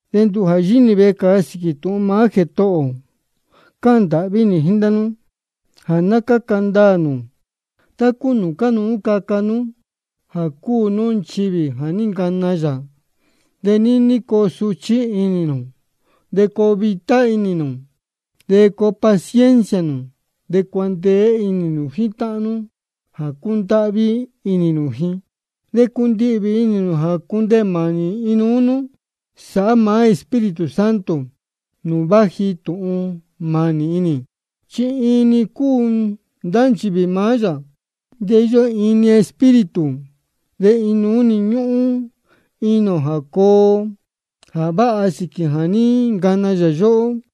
De nduhū jā yíhí nī vecāa sīquī tūhun maá Jētohō ō, cáhān ndāhví nī jíín ndá nú jā ná cáca ndaā nū tá cúu nūū cánuú caca nú jā cúu nú nchivī jā ní ncana yā. De níní coo suchí inī nū, de coo vitá inī nū. De coo paciencia nū, de cuandeé inī nū jíín táhán nú jā cúndáhví inī nū ji. De cundihvī inī nū jā cundeē mānī inuú nú, sāhá maá Espíritu Santo nūū váji tūhun mānī inī. Chi iin-ni cúu ndá nchivī maá yā, de íyó iin-ni Espíritu, de inuú ñúhún inī ō jā coo jā váha sīquī jā ní ncana yā yóhó.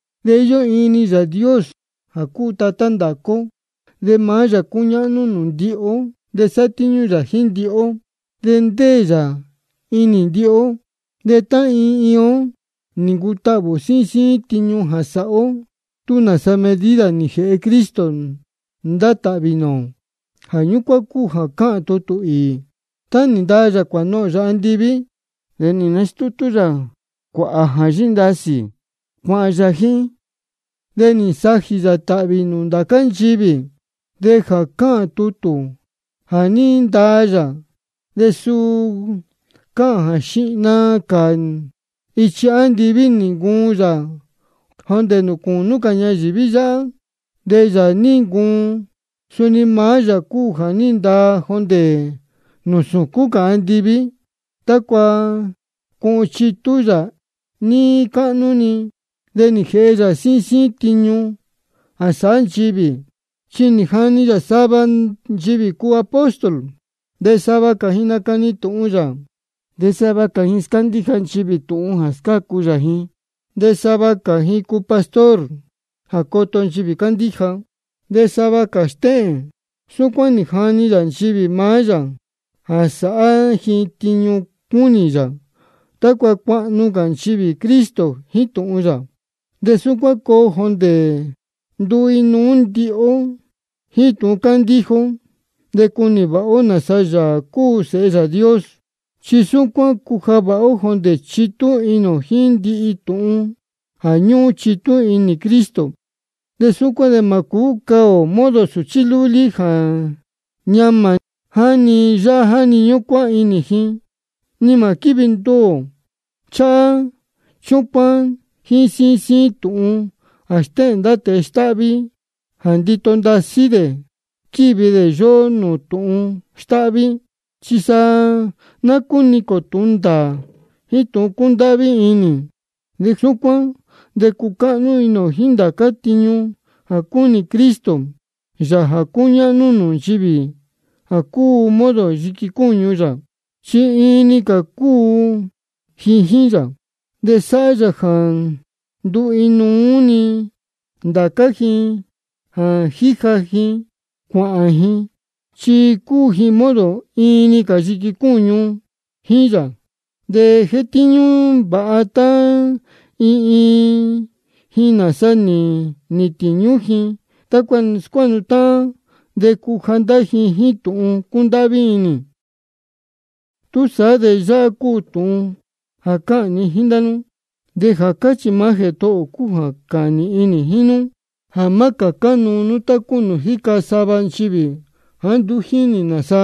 De íyó iin-ni Yāā Dios jā cúu Tatá ndācá ó. De maá yā cúñáhnú nūū ndihi ó, de sátíñú yā jíín ndihi ó, de ndéē yā inī ndihi ó. De tá iin iin ó nī ncutahvī ō síín síín tiñu jā sáhá ó, tú nāsa medida nī jēhe Cristo ndá tāhvī nūū ō. Jā ñúcuán cúu jā cáhān tutū īī: Tá nī ndaa yā cuānohōn yā andiví, de nī nastútú yā cuāhā jā yíndasī, cuāhān yā jíín. De nī nsajī yā tāhvī nūū ndācá nchivī. De jā cáhān tutū jā ní ndaa yā, de suu cáhān jā xihna cā ichi andiví nī ncuun yā jondē nūū cūnú cā ñayīví yáhá. De Yāā jā ní ncuun, suni maá yā cúu jā ní ndaa jondē nūū sūcún cā andiví, tácua cuhun chitú yā níí cáhnú-ni. De nī jēhe yā síín síín tiñu jā sáhá nchivī. Chi nī jani yā sava nchivī cuu apóstol, de sava cā nacani tūhun yā, de sava cā scándíja nchivī tūhun jā scácu yā ji, de sava cā cuu pastor jā coto nchivī cándíja, de sava cā stéhēn. Súcuán nī jani yā nchivī maá yā jā sāhá ji tiñu cúnī yā, tácua cuahnu cā nchivī Cristo jíín tūhun yā. De súcuán coo jondē nduu inuú-ni ndihi ó jíín tūhun cándíja ó, de cunī vāha ó nāsa Yāā cúu Sēhe Yāā Dios. De súcuán cuja vāha ó jondē chitú inī ō jíín ndihi tūhun jā ñúhún chitú inī Cristo. De súcuán de mā cūú cā ō modo sūchí lúlí jā ñamā jáni yáhá jáni ñúcuán inī ji, ni mā quívi nduū ō cháhá chúcuán jíín síín síín tūhun jā stéhēn ndá tēe stáhví jā ndito ndasí dē squívi dē yóhó nūū tūhun stáhví. Chi sa ná cúniquīn ō tūhun ndāā jíín tūhun cúndáhví inī. De súcuán de cuahnu ó jíín ndācá tiñu jā cúnī Cristo, Yāā jā cúñáhnú nūū nchivī jā cúu modo yiqui cúñu yā, chi iin-ni cā cúu ji jíín yā. De sáhá yā jā nduu inuú-ni ndācá ji jā jíja ji cuāhān ji, chi cúu ji modo iin-ni cā yiqui cúñu jíín yā. De jétíñú vāha tá iin iin ji nāsa nī nīhīn tīñú ji, tácua scuáhnu táhán de cuja ndá ji jíín tūhun cúndáhví inī. Túsaá de yáhá cúu tūhun jā cáhān ni jíín ndá nú, de jā cáchī maá Jētohō ō cúu jā cáhān nīhin nī jíín nú: Jā má cācá cā nū tá cúu nūū jíca sava nchivī jāá nduú jínī ji nāsa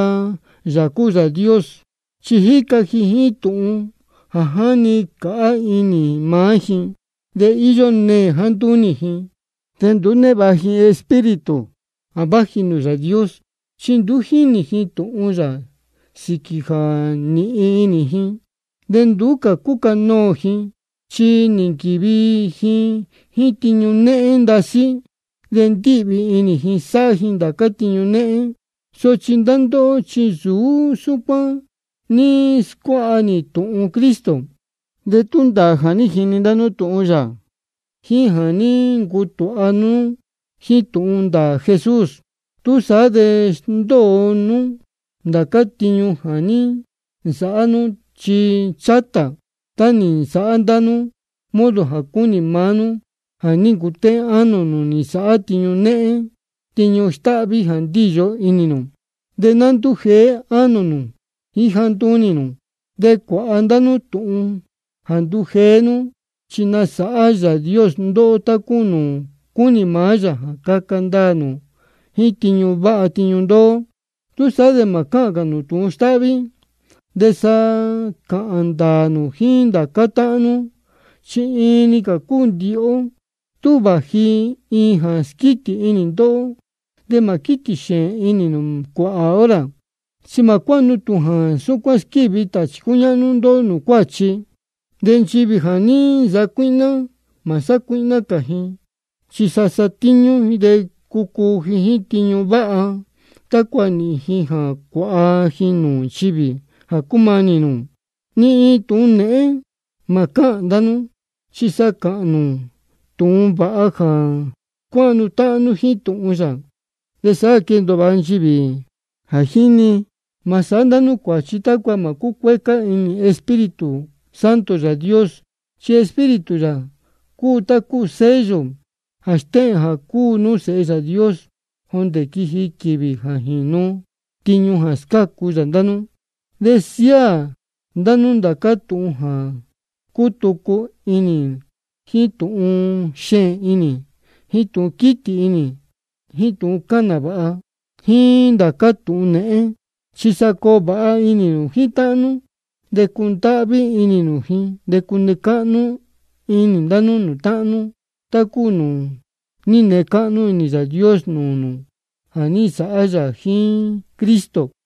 Yāā cúu Yāā Dios, chi jíca ji jíín tūhun jā jáni cāhá inī maá ji. De íyó neē jāá ntúnī ji, de nduú névāha ji Espíritu jā váji nūū Yāā Dios, chi nduú jínī ji tūhun yā, sīquī jā nīhin inī ji. De nduú cā cúcanoō ji, chi nī nquīvi ji jíín tiñu néhén ndasí, de ndíhvī inī ji sáhá ji ndācá tiñu téhén. Sochi ndá ndóhó, chi nsūú súcuán nī scuáha nú tūhun Cristo, de tú ndāā jā ní jini ndá nú tūhun yā jíín jā ní ncutūha nú jíín tūhun ndāā Jesús. Túsaá de sndóo nú ndācá tiñu jā ní nsāhá nú ichi chátā, tá nī nsāhá ndá nú modo jā cúnī maá nú jā ní ncutéhén ánō nū nī nsāhá tiñu néhén tiñu stáhví jā ní ndīyo inī nū. De ná ndújeé ánō nū jíín jāá ntúnī nū. De cuāha ndá nú tūhun jā ndujeé nú, chi nasāhá Yāā Dios ndóhó tá cúu nūū cúnī maá yā jā caca ndaā nū jíín tiñu váha tiñu ndoo. Túsaá de mā cáhān cā nū tūhun stáhví, de sa cāhān ndāā nū jíín ndācá táhán nú, chi iin-ni cā cúu ndihi ó. Tú vāji iin jā squítī inī ndóhó, de mā quítī xēēn inī nū cuāhā hora. Chi mā cuáha nú tūhun jā súcuán squívi tāchī cúñáhnú ndóhó nūū cuáchi. De nchivī jā ní nsacuíhná, mā sácuíhná cā ji, chi sa satíñú ji, de cucuu ji jíín tiñu váha, tácua nīhīn ji jā cuāha ji nūū nchivī jā cúmanī nūū. Ni iin tūhun nēhén mā cáhān ndá nú, chi sa cāhān nū tūhun vāha jā scuáhnu táhán jíín tūhun yā, de sáhá jā quéndōo vāha nchivī jā jíni. Mā sāhá ndá nú cuāchi tácua mā cúcuécá inī Espíritu Santo Yāā Dios. Chi Espíritu yā cúu tá cúu sello jā stéhēn jā cúu nú sēhe Yāā Dios, jondē quiji quīvī jā jīnu tiñu jā scácu yā ndá nú. De siáā ndá nú ndācá tūhun jā cútucu inī, jíín tūhun xēēn inī, jíín tūhun quítī inī, jíín tūhun cáhān nāvāha, jíín ndācá tūhun nēhén. Chi sa coo vāha inī nū jíín táhán nú, de cundáhví inī nū ji. De cune cáhnú inī ndá nú nūū táhán nú, tá cúu nūū ní nee cáhnú inī Yāā Dios nūū nū jā ní nsāhá yā jíín Cristo.